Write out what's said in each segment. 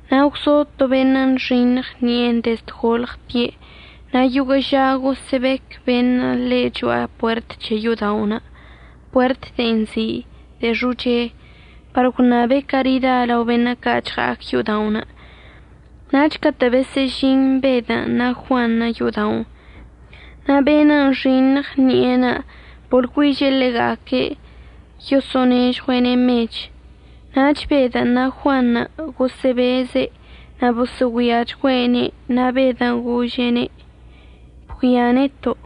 Na' gwzo to beṉə' nxiṉɉ ṉi'enə' dezd golɉtie' na' yoguə' ža gosə'əbec beṉə' ḻe' cho'a puert c̱he yo'oda'onə' puert de'en nzi' “De'e Xoche”, par gwṉabe' carida lao beṉə' ca' chɉa'ac yo'oda'onə'. Nach catə' besə'əžin Bedən' na' Juanṉə' yo'oda'onə' na' be'enə' nxiṉɉ ṉi'enə' boḻgüiže' ḻega'aque' yoso'onežɉue'ene' mech. Nach Bedən' na' Juanṉə' gosə'əbeze' na' bosə'əgüiachgüe'ene' na' Bedən' gože'ene': ―Bgüia neto'.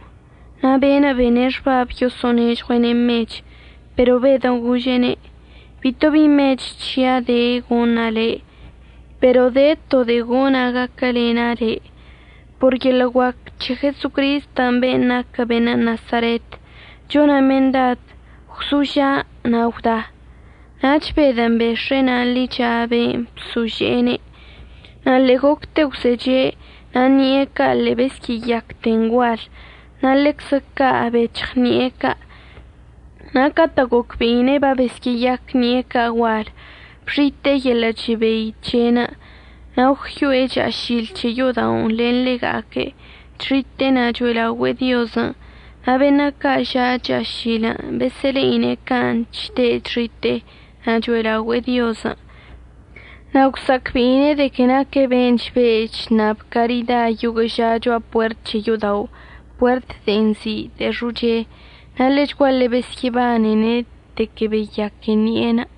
Na' be'enə' bene' xbab yoso'onežɉue'ene' mechən'. Pero Bedən' gože'ene': ―Bito bi mech c̱hia' de goṉa' le', pero de to de'e gona' gaquəlena' le'. Por yeḻə' guac c̱he Jesocristən' ben' naquə beṉə' Nasaretən' chona' mendad gwzoža' na' gwda. Nach Bedən' bex̱e'e na' ḻicha be'en bsože'ene', na' ḻe'e gocte gwzeche' na' ṉi'e ca' ḻe'e besyə'əyacten gual na' ḻeczə ca' bec̱hɉ ṉi'e ca'. Na' catə' gocbe'ine' babesyə'əyac ṉi'e ca' gual bxite'e yeḻə' chebei c̱he'enə'. Na' gwyo'e cha'ašil c̱he yo'oda'onə' len ḻega'aque' chxite'e na' cho'elaogüe'e Diozən'. Na' beṉə' ca' ža' cha'ašilən' besə'əle'ine' can' chde' chxite'e na' cho'elaogüe'e Diozən'. Na' gwsa'acbe'ine' de que naque' ben' chbe' chṉab carida yoguə' ža cho'a puert c̱he yo'oda'onə' puert de'en nzi' “De'e Xoche”, na' ḻechguaḻe besyə'əbanene' de que babeyaque ṉi'enə'.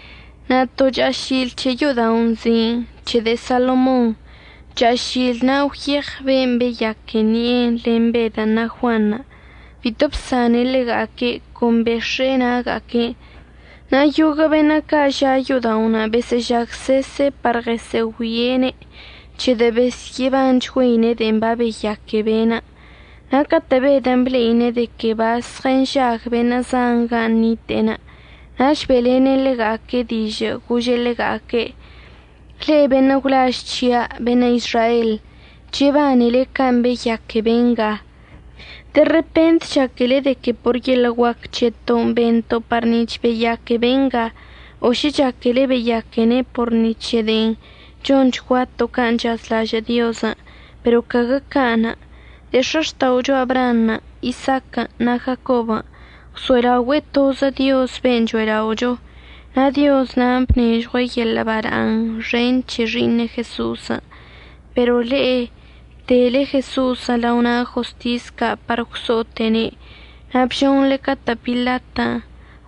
Na' to cha'ašil c̱he yo'oda'onə' nzi'in “C̱he de'e Salomonṉə'”. Cha'ašil na' gwyeɉ ben' beyaque ṉi'enə' len Bedən' na' Juanṉə'. Bito bsane' ḻega'aque', con bex̱e'e na'aga'aque'enə', na' yoguə' beṉə' ca' ža' yo'oda'onə' besə'əžagsese' par ɉəsə'əgüie'ene' c̱hedə' besyə'əbanchgüeine' de'en babeyaque be'enə'. Na' catə' Bedən' ble'ine' de que bazɉənžag beṉə' zan gan' nite'enə' nach be'elene' ḻega'aque' dižə' gože' ḻega'aque': ―Le'e beṉə' gwlaž c̱hia' beṉə' Izrael, chebanele can' babeyaque be'enga. De repent chaquele de que por yeḻə' guac c̱heton' bento' par nic̱h beyaque be'enga o šə chaquele beyaquene' por ni c̱he de'en chonchguato' can' chazlažə' Diozən', pero caguə ca'anə'. De'e x̱axta'ocho Abraanṉə', Isaaquən' na' Jacobən' gwso'elaogüe'e tozə Diozən' ben' cho'ela'ocho, na' Dioz na'anə' bnežɉue' yeḻə' bala'aṉ xen c̱he Xi'iṉe' Jeso'osən'. Pero le'e bdele Jeso'osən' lao na' jostis ca' par gwso'ote'ene' na' bžonḻe catə' Pilatən'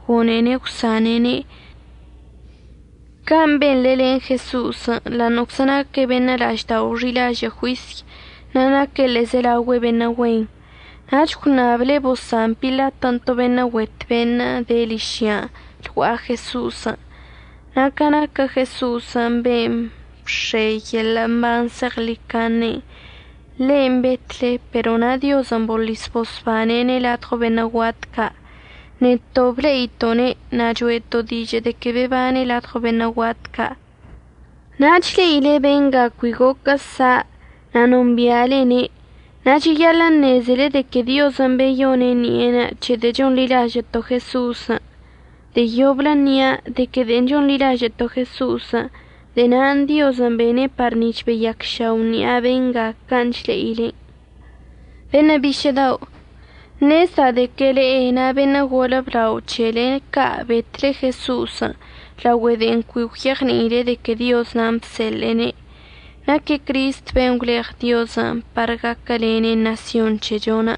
gone'ene' əgwsane'ene'. Can' benḻe len Jeso'osən' ḻa'aṉə'əczə naque' beṉə' la'aždao' xi'ilažə' juisy na' naque' ḻe'ezelaogüe beṉə' güen. Nach gwṉable bosan Pilatən' to beṉə' güet beṉə' de ližyan' lgua'a Jeso'osən'. Na' ca naquə Jeso'osən' ben' əbx̱e yeḻə' mban zeɉḻicaṉen', ḻe'enə' betle pero na' Diozən' boḻis bosbane'ene' ladɉo beṉə' guat ca'. Neto' ble'ito'one' na' cho'eto' dižə' de que bebane' ladɉo beṉə' guat ca'. Na' chle'ile benga cui goquə sa' na' nombi'alene', na' cheyaḻə' əṉezele de que Diozən' beyone' ṉi'enə' c̱hedə' chonḻilažə'əto' Jeso'osən'. De'e yoblə nia' de que de'en chonḻilažə'əto' Jeso'osən' de'e na'anə' Diozən' bene' par nic̱h beyacšao' ṉi'a benga can' chle'ilen'. Beṉə' bišə' dao', ṉezda' de que le'e na' beṉə' golə blao c̱hele ca' betle Jeso'osən' laogüe de'en cui gwyeɉni'ile de que Dioz nan' bseḻe'ene'. Naque' Cristən' ben' gwleɉ Diozən' par gaquəlene' ṉasyon c̱hechon'.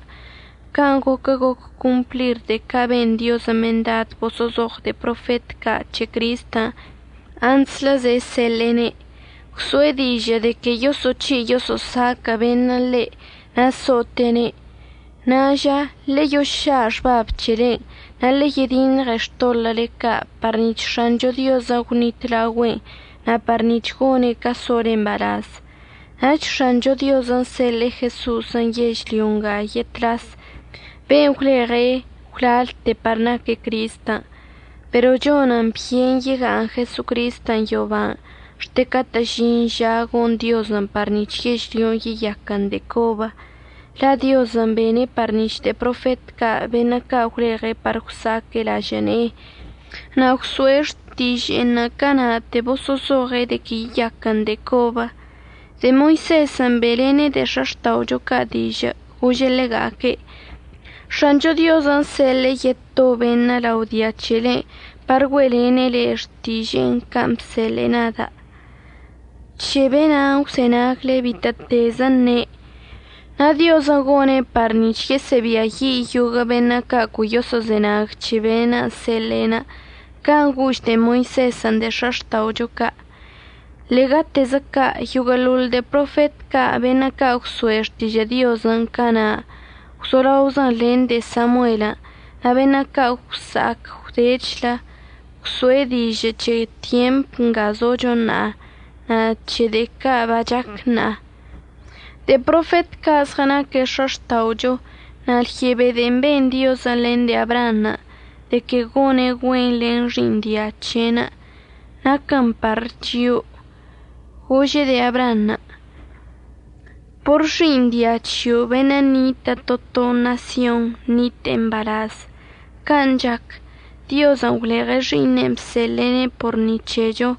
Can' goquə goc complir de'e ca' ben Diozən' mendad boso'ozoɉ de'e profet ca' c̱he Cristən' antslə ze'e seḻe'ene'. Gwso'e dižə' de que yoso'oc̱hi' yoso'osaquə' beṉə' ḻe' na' so'ote'ene'. Ṉa'a ža ḻeyoša' xbab c̱helen' na' ḻe'e yediṉɉe xtoḻə'əle ca' par nic̱h X̱ancho Diozən' gwnitlaogüe'en na' par nic̱h gone' ca sole mbalaz. Nach X̱ancho Diozən' seḻe'e Jeso'osən' yežlyo nga yetlas ben' gwleɉe' gwlalte par naque' Cristən'. Pero chonən byen yega'aṉ Jesocristən' yoban' xte catə' əžin ža gon Diozən' par nic̱h yežlyon' yeyaquən de'e cobə. La' Diozən' bene' par nic̱h de'e profet ca' beṉə' ca' gwleɉe' par gwsa'aque' lažə' ne'enə' na' gwso'e xtiže'enə' cana'ate boso'ozoɉe' de que yeyaquən de'e cobə. De'e Moisezən' be'elene' de'e x̱axta'ocho ca' dižə' gože' ḻega'aque': “X̱ancho Diozən' seḻe'e yeto beṉə' lao dia c̱helen' par güe'elene' le'e xtiže'enə' can' bseḻe'e nada'. C̱he be'enan' gwzenagle bitə'ətezə əṉe'. Na' Diozən' gone' par nic̱h yesə'əbiayi' yoguə' beṉə' ca' cui yoso'ozenag c̱he be'enə' əseḻe'e.” Can' gož de'e Moisezən' de'e x̱axta'ocho ca'. Ḻe'egatezə ca' yoguə'əḻoḻ de'e profet ca' beṉə' ca' gwso'e xtižə' Diozən' cana' gwzolaozən' len de'e Samuelən' na' beṉə' ca' gwsa'ac gwdechlə gwso'e dižə' c̱he tyemp nga zocho ṉa'a na' c̱he de'e ca' bachac ṉa'a. De'e profet ca' zɉənaque' x̱axta'ocho na' lyebe de'en ben Diozən' len de'e Abraanṉə' de que gone' güen len xi'iṉ dia c̱he'enə' naquən par chio'o. Gože' de'e Abraanṉə': “Por xi'iṉ dia c̱hio' beṉə' ṉitə' to to ṉasyon ṉite'e mbalaz.” Can' chac, Diozən' gwleɉe' Xi'iṉen' bseḻe'ene' por ni c̱hecho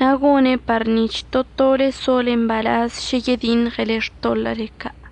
na' gone' par nic̱h to tole sole mbalaz šə yediṉɉele xtoḻə'əle ca'.